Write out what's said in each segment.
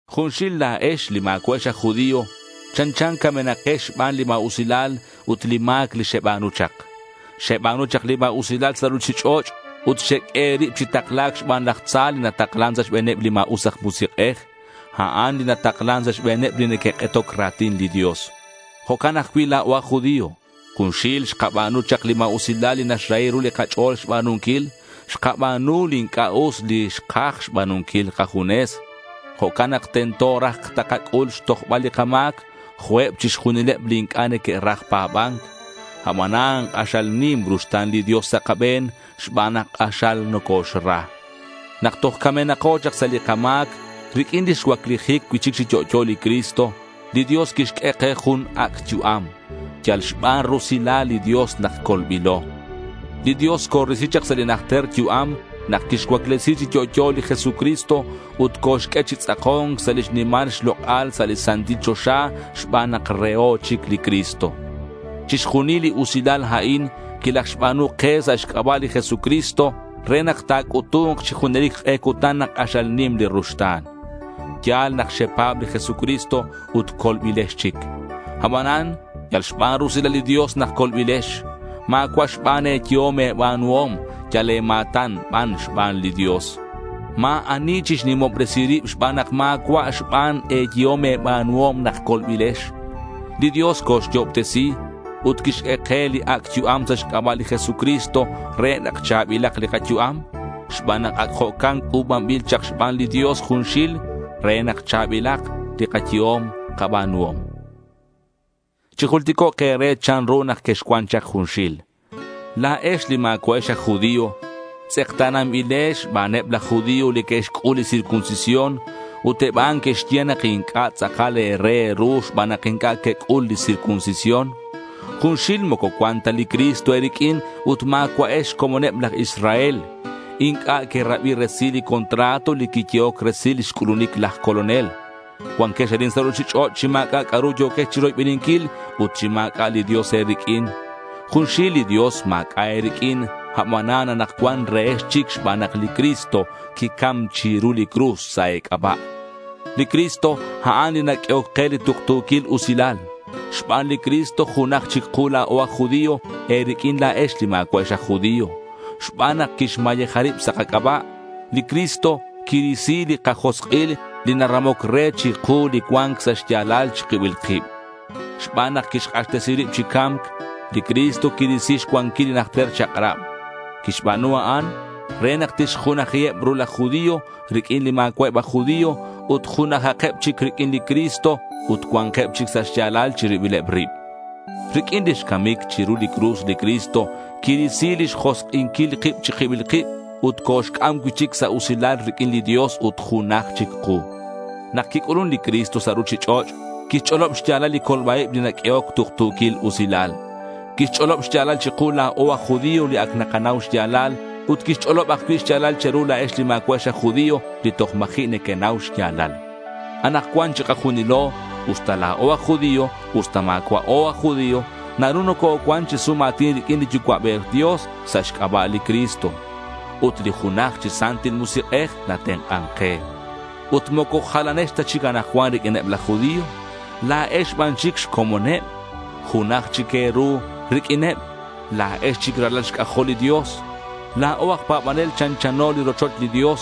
Junxil la̱ex li ma̱cua'ex aj judío chanchan camenakex xban li ma̱usilal ut li ma̱c li xeba̱nu chak. Xeba̱nu chak li ma̱usilal sa' ruchich'och' ut xeq'ue e̱rib chi takla̱c xban laj tza li nataklan sa' xbe̱neb li ma̱us aj musik'ej. A'an li nataklan sa' xbe̱neb li neque'k'etoc ra̱tin li Dios. Jo'can ajcui' la̱o aj judío. Junxil xkaba̱nu chak li ma̱usilal li naxrahi ru li kach'o̱l xba̱nunquil. Xkaba̱nu li inc'a' us li xkaj xba̱nunquil kajunes. Jo'can nak tento raj takac'ul xtojbal li kama̱c jo' eb chixjunileb li inc'a' neque'raj pa̱ba̱nc. Abanan k'axal nim li ruxta̱n li Dios sa' kabe̱n xban nak k'axal nocoxra. Nak toj camenako chak sa' li kama̱c, riq'uin lix cuaclijic cui'chic chi yo'yo li Cristo, li Dios quixq'ue ke jun ac' yu'am. Yal xban rusilal li Dios nak colbilo. Li Dios corisi chak sa' li najter yu'am nak quixcuaclesi chi yo'yo li Jesucristo ut coxq'ue chi tz'ako̱nc sa' lix nimal xlok'al sa' li santil choxa xban nak reho chic li Cristo. Chixjunil li usilal a'in quilajxba̱nu ke sa' xc'aba' li Jesucristo re nak ta̱c'utu̱nk chi junelic k'e cutan nak k'axal nim li ruxta̱n. Ya̱l nak xepa̱b li Jesucristo ut colbilex chic. Abanan yal xban rusilal li Dios nak colbilex. Ma̱cua' xban e̱yehom e̱ba̱nuhom. Yal e̱ma̱tan ban xban li Dios. Ma̱ ani chixnimobresi rib xban nak ma̱cua' xban e̱yehom e̱ba̱nuhom nak colbilex. Li Dios coxyo'obtesi ut quixq'ue ke li ac' yu'am sa' xc'aba' li Jesucristo re nak cha̱bilak li kayu'am xban nak ac jo'can c'u̱banbil chak xban li Dios junxil re nak cha̱bilak li kayehom kaba̱nuhom. Chijulticok' e̱re chanru nak quexcuan chak junxil. La̱ex li ma̱cua'ex aj judío tz'ekta̱nanbilex xbaneb laj judío li que'xc'ul li circuncisión, ut eb a'an que'xye nak inc'a' tz'akal e̱re e̱ru xban nak inc'a' quec'ul li circuncisión. Junxil moco cuan ta li Cristo e̱riq'uin ut ma̱cua'ex xcomoneb laj Israel. Inc'a' querabi resil li contrato li quiyehoc resil lix c'ulunic laj Colonel. Cuanquex arin sa' ruchich'och' chi ma̱c'a' c'a'ru yo̱quex chiroybeninquil ut chi ma̱c'a' li Dios e̱riq'uin. Junxil li Dios ma̱c'a' e̱riq'uin. Abanan anakcuan rehex chic xban nak li Cristo quicam chiru li cruz sa' e̱c'aba'. Li Cristo, a'an li naq'uehoc ke li tuktu̱quil usilal. Xban li Cristo junaj chic ku la̱o aj judío e̱riq'uin la̱ex li ma̱cua'ex aj judío. Xban nak quixmayeja rib sa' kac'aba', li Cristo quirisi li kajosk'il li naramoc re chiku li cua̱nc sa' xya̱lal chi kibil kib. Xban nak quixk'axtesi rib chi ca̱mc, li Cristo quirisi xcuanquil li najter chak'rab. Quixba̱nu a'an re nak tixjunajiheb ru laj judío riq'uin li ma̱cua'eb aj judío ut junajakeb chic riq'uin li Cristo ut cua̱nkeb chic sa' xya̱lal chi ribileb rib. Riq'uin lix camic chiru li cruz li Cristo quirisi lix josk'inquil kib chi kibil kib ut coxc'am cui'chic sa' usilal riq'uin li Dios ut junaj chic ku. Nak quic'ulun li Cristo sa' ruchich'och' quixch'olob xya̱lal li colba-ib li naq'uehoc tuktu̱quil usilal. Quixch'olob xya̱lal chiku la̱o aj judío li ac nakanau xya̱lal. Ut quixch'olob ajcui' xya̱lal che̱ru la̱ex li ma̱cua'ex aj judío li toj ma̱ji' nequenau xya̱lal. Anakcuan chikajunilo, usta la̱o aj judío usta ma̱cua'o aj judío, naru nococuan chi sum a̱tin riq'uin li Yucua'bej Dios sa' xc'aba' li Cristo. Ut li junaj chi Santil Musik'ej natenk'an ke. Ut moco jalanex ta chic anakcuan riq'uineb laj judío. La̱ex ban chic xcomoneb. Junaj chic e̱ru riq'uineb. La̱ex chic ralal xc'ajol li Dios. La̱o aj pa̱banel chanchano li rochoch li Dios.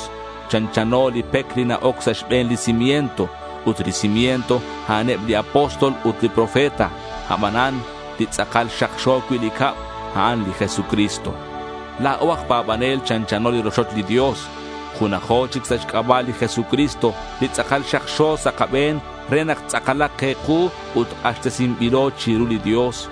Chanchano li pec li na-oc sa' xbe̱n li cimiento. Ut li cimiento, a'aneb li apóstol ut li profeta. Abanan li tz'akal xakxo cui' li cab, a'an li Jesucristo. La̱o aj pa̱banel chanchano li rochoch li Dios. Junajo chic sa' xc'aba' li Jesucristo li tz'akal xakxo sa' kabe̱n re nak tz'akalak ke ku ut k'axtesinbilo chiru li Dios.